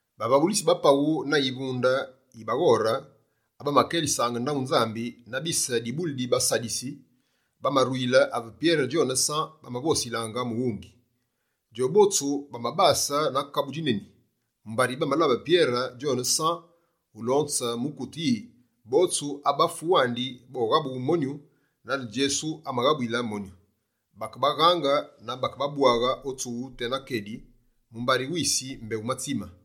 Bavaghulitsi ba paghu na yivunde yi baghore abamakelisaange ndaghu Nzambi, na bise dibuli di baSadisi bamaruyile ave Pyere djone San bamavosilaange mughungi. Djobotsu bamabase na kabu djineni, mumbari bamalabe Pyere djone San ulonze mukute yi: botsu abafu wandi boghabughe monyu, nane Djesu amaghabuyile monyu. Bakebaghaange na bakebabwaghe o tsughu tena kedi, mumbari wisi mbé wumatsime.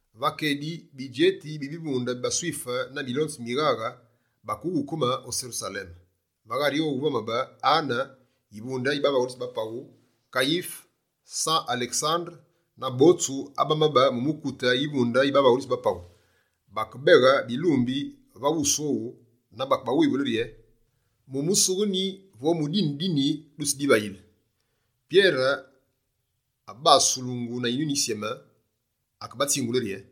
Va kedi, bidjeti, bivunde bi baSwife na milonzi mi mighaghe bakeghukeme o Serusaleme. Va ghari owu vamabe: Ane yivunde yi bavaghulitsi ba paghu, Kayife, San, Alesandere na botsu abamabe mu mukute yivunde yi bavaghulitsi ba paghu. Bakebeghe bilumbi va wusu owu na bakebawivule rye: «Mu musughe nyi vo mu dine di nyi dutsidivayile?» Pyere, abasulungu na Yinyuni Yisyeme, akebatsingule rye: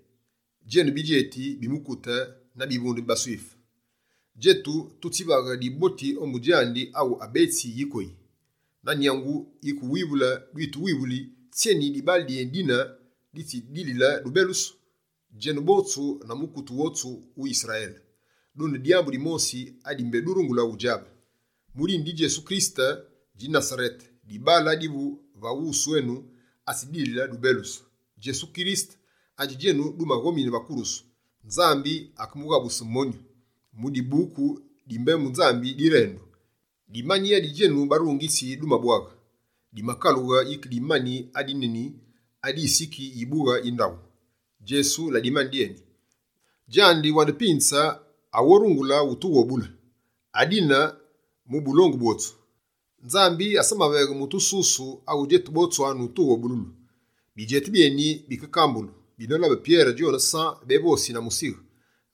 «Djenu bidjeti bi mukute na bivunde bi baSwife, djetu tutsivaghe diboti ombu djandi awu abetsi yikoyi. Na nyangu yike wuwivule dwituwivuli, tsyeni dibaale dyédine ditsidilile dubelusu? Djenu botsu na mukute wotsu wu Yisrayele, dune dyambu dimosi adi mbé durungule udjabe: mu dine di Djesu Kirisete mwise Nasarete, dibaale adivu va wusu enu atsi dilile dubelusu. Djesu Kirisete adji djenu dumaghomine va kurusu, Nzambi akemughabuse monyu. Mu Dibuku di Mbembu Nzambi direndu: “Dimani adi djenu barungitsi dumabwaghe, dimakalughe yike dimani, adi neni adi siki yibughe yi ndaghu.” Djesu la dimani dyeni. Djandi wandi pinze, awu orungulu wutughobule. Adine, mu bulongu bwotsu, Nzambi asamaveghe mutu susu, awu djetu botwanu tughobululu.» Bidjeti byeni bike kambulu, binolabe Pyere djone San bévosi na musighe.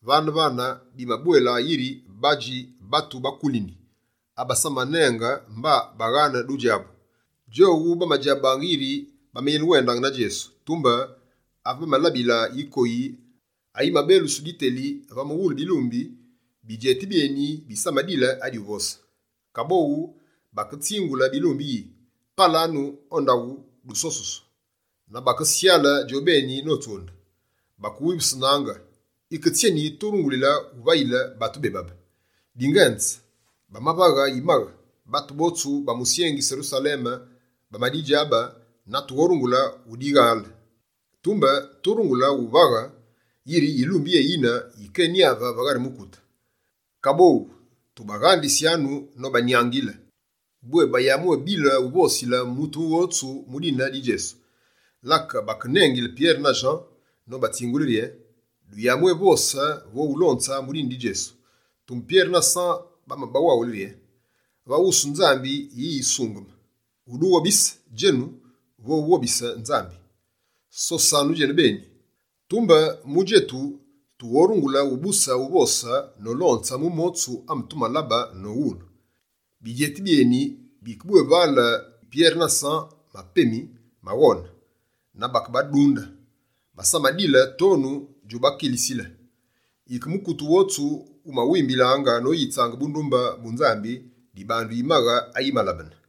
Vane-vane, bimabwélabe yiri badji batu ba kulini, abasamanenge mba baghane dudjabu. Djowu, bamabadjabaange bwé bamayenewendaange na Djesu. Tumbe, ave bamalabilaange yikoyi ayi mabelusu, diteli va mughule bilumbi, bidjeti byeni bisamadile adi uvose. Kaboghu, baketsingule bilumbi yi: «Palanu o ndaghu dusosusu!» Na bakesyale djobeni notsunde. Bakewivusenaange: «Yike tsyeni turungule wuvayile batu bebabe? Dingenze, bamavaghe yimaghe, batu botsu ba musyengi Serusaleme bamadidjabe, na tughorungule udighale. Tumbe, turungule uvaghe yiri yilumbi yéyine yikényave va ghari mukute. Kaboghu, tubaghandisyanu nobanyangile bwé bayabwé bile uvosile mutu wotsu mu dine di Djesu.» Lake bakenengile Pyere na San, nobatsingule rye: «Duyabwévose vo ulonze mu dine di Djesu.» Tumbe Pyere na San bamabawaghule rye: «Va wusu Nzambi, yi yisungeme: wudughobise djenu, vo wughobise Nzambi? Sosanu djenubeni! Tumbe mu djetu, tughorungule ubuse uvose nolonze mu motsu ame tumalabe nowulu.» Bidjeti byeni bike bwévale Pyere na San mapemi maghone na bakebadunde, basamadile tonu djubakilisile. Yike mukute wotsu wumawimbilaange noyitse bundumbe bu Nzambi dibandu yimaghe ayimalabene.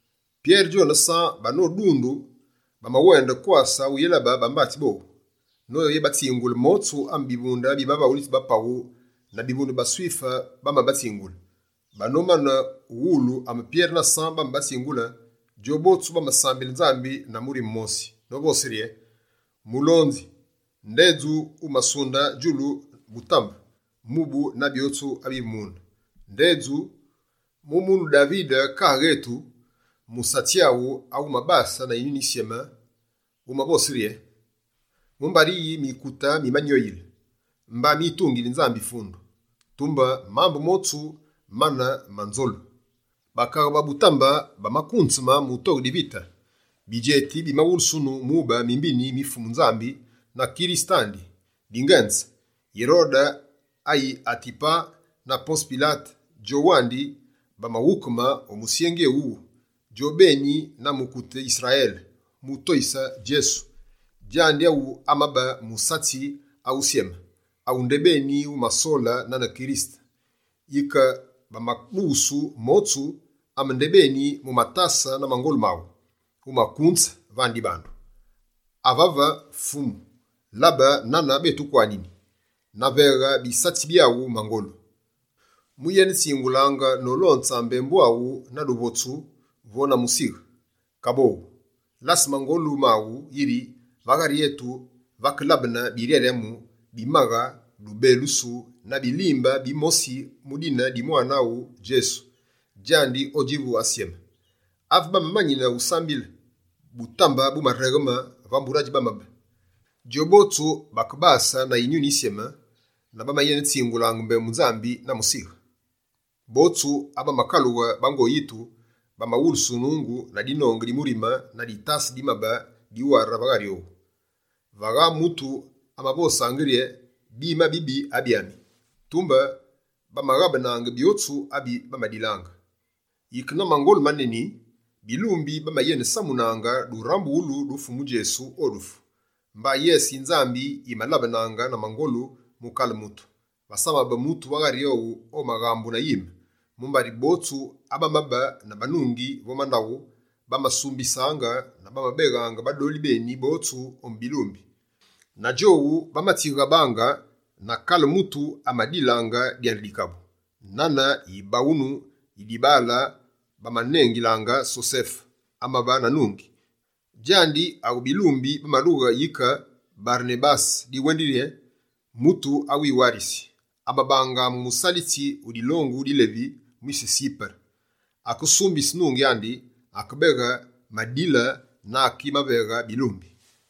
Pyere djone San banodundu, bamawende kwase uyélabe bambatsi bowu, noyebatsingule motsu ame bivunde bi bavaghulitsi ba paghu, na bivunde bi baSwife bamabatsingule. Banomane ughuwulu ame Pyere na San bamabatsingule, djobotsu bamasambile Nzambi na murime wumosi, novose rye: «Mulonzi, ndedju wumasunde djulu, butambe, mubu na byotsu abivu mune. Ndedju, mu munu Davide kaaghe etu, musatsi aghu awumabase na Yinyuni Yisyeme, wumavose rye: “Mumbari yi mikute mimanyoyile? Mba mitungili Nzambi fundu, tumbe mambu motsu mane ma nzolu. Bakaghe ba butambe bamakunzeme mutoghe divite, bidjeti bimawulusunu mube mimbini mi Fumu Nzambi na Kirisete andi.” Dingenze, Yirode ayi Atipa na Ponze Pilate djowandi, bamaghukeme o musyengi éwuwu, djone beni na mukute Yisrayele, mu toyise Djesu. Djandi awu amabe musatsi awusyeme, awu ndebeni wumasole nane Kirisete. Yike bamadughusu motsu ame ndebeni, mu matase na mangolu maghu, wumakunze vane dibandu. Avave Fumu, labe nane bétukwanini, na veghe bisatsi byaghu mangolu moyenetsingulaange nolonze mbembu aghu na duvotsu vo na musighe. Kaboghu, lase mangolu maghu yi va ghari etu vakelabene biryaryamu, bimaghe, dubelusu na bilimbe bimosi mu dine di musalitsi aghu Djesu, djandi odjivu asyeme.» Ave bamamanine wusambile, butambe bumaregheme va mbure adji bamabe. Djobotsu bakebase na Yinyuni Yisyeme na bamayenetsingulaange mbembu Nzambi na musighe. Botsu abamakalughe bango yitu, bamawulusunungu, na dinonge di murime na ditase dimabe diware va ghari owu. Vagha mutu amavosaange rye: «Bime abibi, abyami!» Tumbe, bamaghabenaange byotsu abi bamadilaange. Yike na mangolu maneni, bilumbi bamayenesamunaange durambughulu du Fumu Djesu o dufu. Mba yese yi Nzambi yimalabenaange na mangolu mu kale mutu. Vasamabe mutu va ghari owu amaghambu na yime, mumbari botsu abamabe na banungi vo mandaghu, bamamasumbisaange na bamabeghaange badoli beni botsu ombu bilumbi. Lake djowu bamatsighabaange, na kale mutu amadilaange dyandi dikabu. Nane yibaghunu yi dibaale bamanengilaange Sosefe, amabe na nungi. Djandi awu bilumbi bamalughe yike Barenabase, diwendili yi: «Mutu awiwarisi», amabaange musalitsi wu dilongu di Levi, mwise Sipere. Akesumbise nungi andi, akebeghe madila na akimaveghe bilumbi.